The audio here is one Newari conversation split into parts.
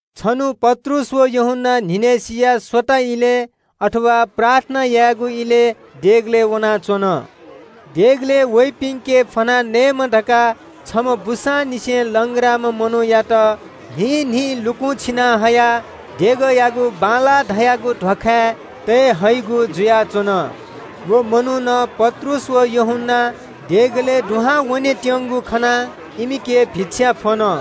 छन्‍हु पत्रुस व यूहन्‍ना न्‍हिनय्‌सिया स्‍वताः इलय्, प्रार्थना यायेगु इलय् देगलय् वनाच्‍वन। देगलय् वइपिन्‍के फ्‍वनाः नयेमा धकाः छम्‍ह बूसांनिसें लंग्राम्‍ह मनूयात न्‍हिं न्‍हिं लुकुं छिना हयाः देगःयागु “बांलाः” धाःगु ध्‍वाखाय् तये हइगु जुयाच्‍वन। व मनुखं पत्रुस व यूहन्‍ना देगलय् दुहां वनेत्‍यंगु खनाः इमिके भिक्षा फ्‍वन।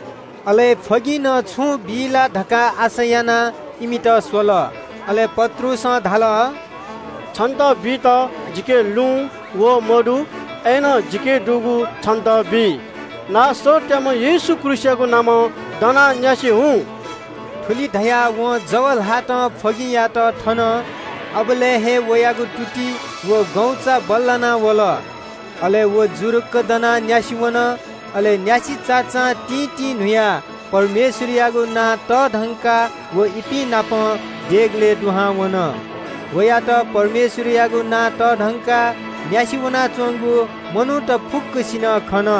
अले फ्‍वगिंनं छुं बी ला धकाः आशा यानाः इमित स्‍वल। अले पत्रुसं धाल – “छितः बीत जिके लुँ, वहः मदु, अय्‌नं जिके दुगु छितः बी। नासरतयाम्‍ह येशू ख्रीष्‍टयागु नामं दनाः न्‍यासि झासँ।” थुलि धयाः वयागु जव ल्‍हातं फ्‍वगिंयात थन। अबलय् हे वयागु तुति व गौचा बल्‍लाना वल। अले व जुरुक्‍क दनाः न्‍यासि वन। अले न्‍यासि चाचां तिंतिंन्‍हुयाः परमेश्‍वरयागु प्रशंसा यायां व इपिं नाप देगलय् दुहां वन। मनूत फुक्‍कसिनं वयात परमेश्‍वरयागु नां तःधंकाः न्‍यासि जुयाच्‍वंगु खन।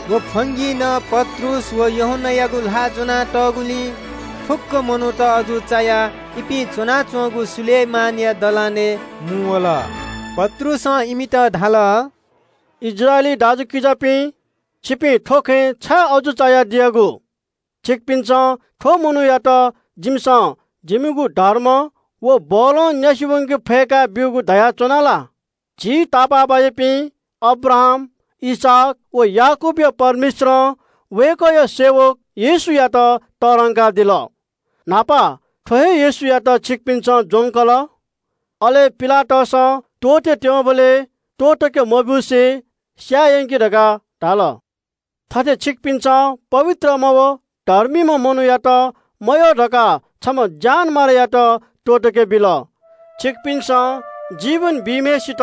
व फ्‍वगिंनं पत्रुस व यूहन्‍नायागु ल्‍हाः ज्‍वना तःगुलिं फुक्‍क मनूत अजू चायाः इपिं च्‍वनाच्‍वंगु सोलोमनया दलानय् मुंवल। पत्रुसं इमित धाल – “इस्राएली दाजुकिजापिं, छिपिं थ्‍व खँय् छाय् अजू चायाः दियागु? छिकपिन्‍सं थ्‍व मनूयात जिमिसं जिमिगु धर्म व बलं न्‍यासि वंके फय्‌का ब्‍यूगु धकाः बिचाः यानाच्‍वनागु ला? झी तापाःबाज्‍यापिं अब्राहाम, इसहाक व याकूबया परमेश्‍वरं वय्‌कःया सेवक येशूयात तःधंकादिल। न्‍हापा थ्‍व हे येशूयात छिकपिन्‍सं ज्‍वंकल। अले पिलातसं त्‍वःतेत्‍यंबलय् त्‍वःतके मब्‍यूसे स्‍याये यंकि धकाः धाल। थथे छिकपिन्‍सं पवित्रम्‍ह व धर्मीम्‍ह मनूयात मयय्‌काः छम्‍ह ज्‍यानमारायात त्‍वःतके बिल। छिकपिन्‍सं जीवन बीम्‍हय्‌सित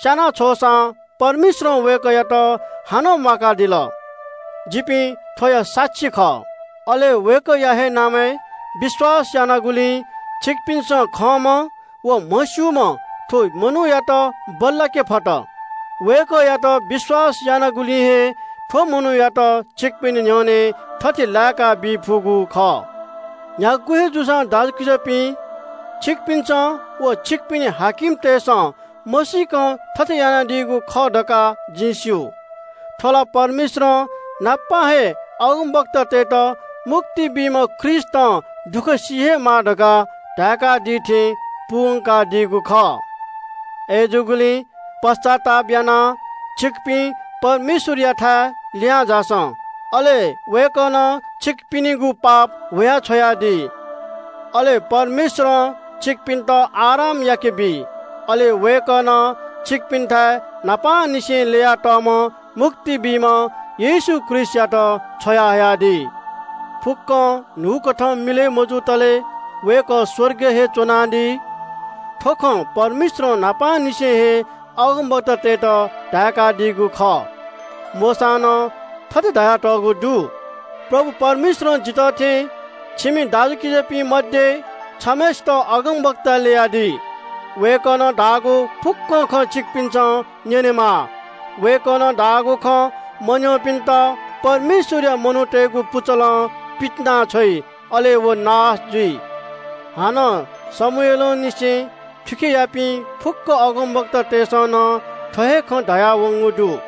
स्‍याना छ्वःसां परमेश्‍वरं वय्‌कःयात हानं म्‍वाकादिल। जिपिं थ्‍वया साक्षी खः। “अले वय्‌कःया हे नामय् विश्‍वास यानागुलिं छिकपिन्‍सं खंम्‍ह व म्‍हस्‍यूम्‍ह थ्‍व मनूयात बल्‍लाके फत। वय्‌कःयात विश्‍वास यानागुलिं हे थ्‍व मनूयात छिकपिनि न्‍ह्यःने थथे लाय्‌काबी फुगु खः।” “न्‍ह्यागु हे जूसां दाजुकिजापिं, छिकपिन्‍सं व छिकपिनि शासकतय्‌सं मसीकं थथे यानादीगु खः धकाः जिं स्‍यू। थ्‍व ला परमेश्‍वरं न्‍हापां हे अगमवक्तातय्‌त मुक्ति बीम्‍ह ख्रीष्‍टं दुःख सी हे माः धकाः धाय्‌कादी थें पूवंकादीगु खः। अय्‌जूगुलिं पश्‍चाताप यानाः छिकपिं परमेश्‍वरयाथाय् लिहांझासँ, अले वय्‌कलं छिकपिनिगु पाप हुयाछ्‌वयादी। अले परमेश्‍वरं छिकपिन्‍त आराम याकेबी। वय्‌कलं छिकपिन्‍थाय् न्‍हापांनिसें ल्‍ययातःम्‍ह मुक्ति बीम्‍ह येशू ख्रीष्‍टयात छ्वयाहयादी। फुक्‍कं न्‍हूकथं मिलय् मजुतले वय्‌कः स्‍वर्गय् हे च्‍वनादी। थ्‍व खँ परमेश्‍वरं न्‍हापांनिसें हे अगमवक्तातय्‌त धाय्‌कादीगु खः। मोशां नं थथे धयातःगु दु – “‘परमप्रभु परमेश्‍वरं जितः थें छिमि इस्राएली दाजुकिजापिं मध्‍ये छम्‍हय्‌सित अगमवक्ता ल्‍ययादी। वय्‌कलं धाःगु फुक्‍क खँ छिकपिन्‍सं न्‍यनेमाः। वय्‌कः अगमवक्तां धाःगु खँ मन्‍यंपिन्‍त परमेश्‍वरया मनूतय्‌गु पुचलं पितिनाछ्वइ, अले व नाश जुइ।’ “हानं शमूएलंनिसें थुखेयापिं फुक्‍क अगमवक्तातय्‌सं नं थ्‍व हे खँ धयावंगु दु।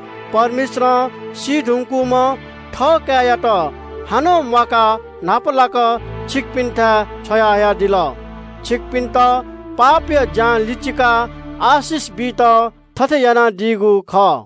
परमेश्‍वरं सी धुंकूम्‍ह थःकाय्‌यात हानं म्‍वाकाः न्‍हापालाक छिकपिन्‍थाय् छ्वयाहयादिल। छिकपिन्‍त पापया ज्‍यां लिचिकाः आशिष बीत थथे यानादीगु खः।”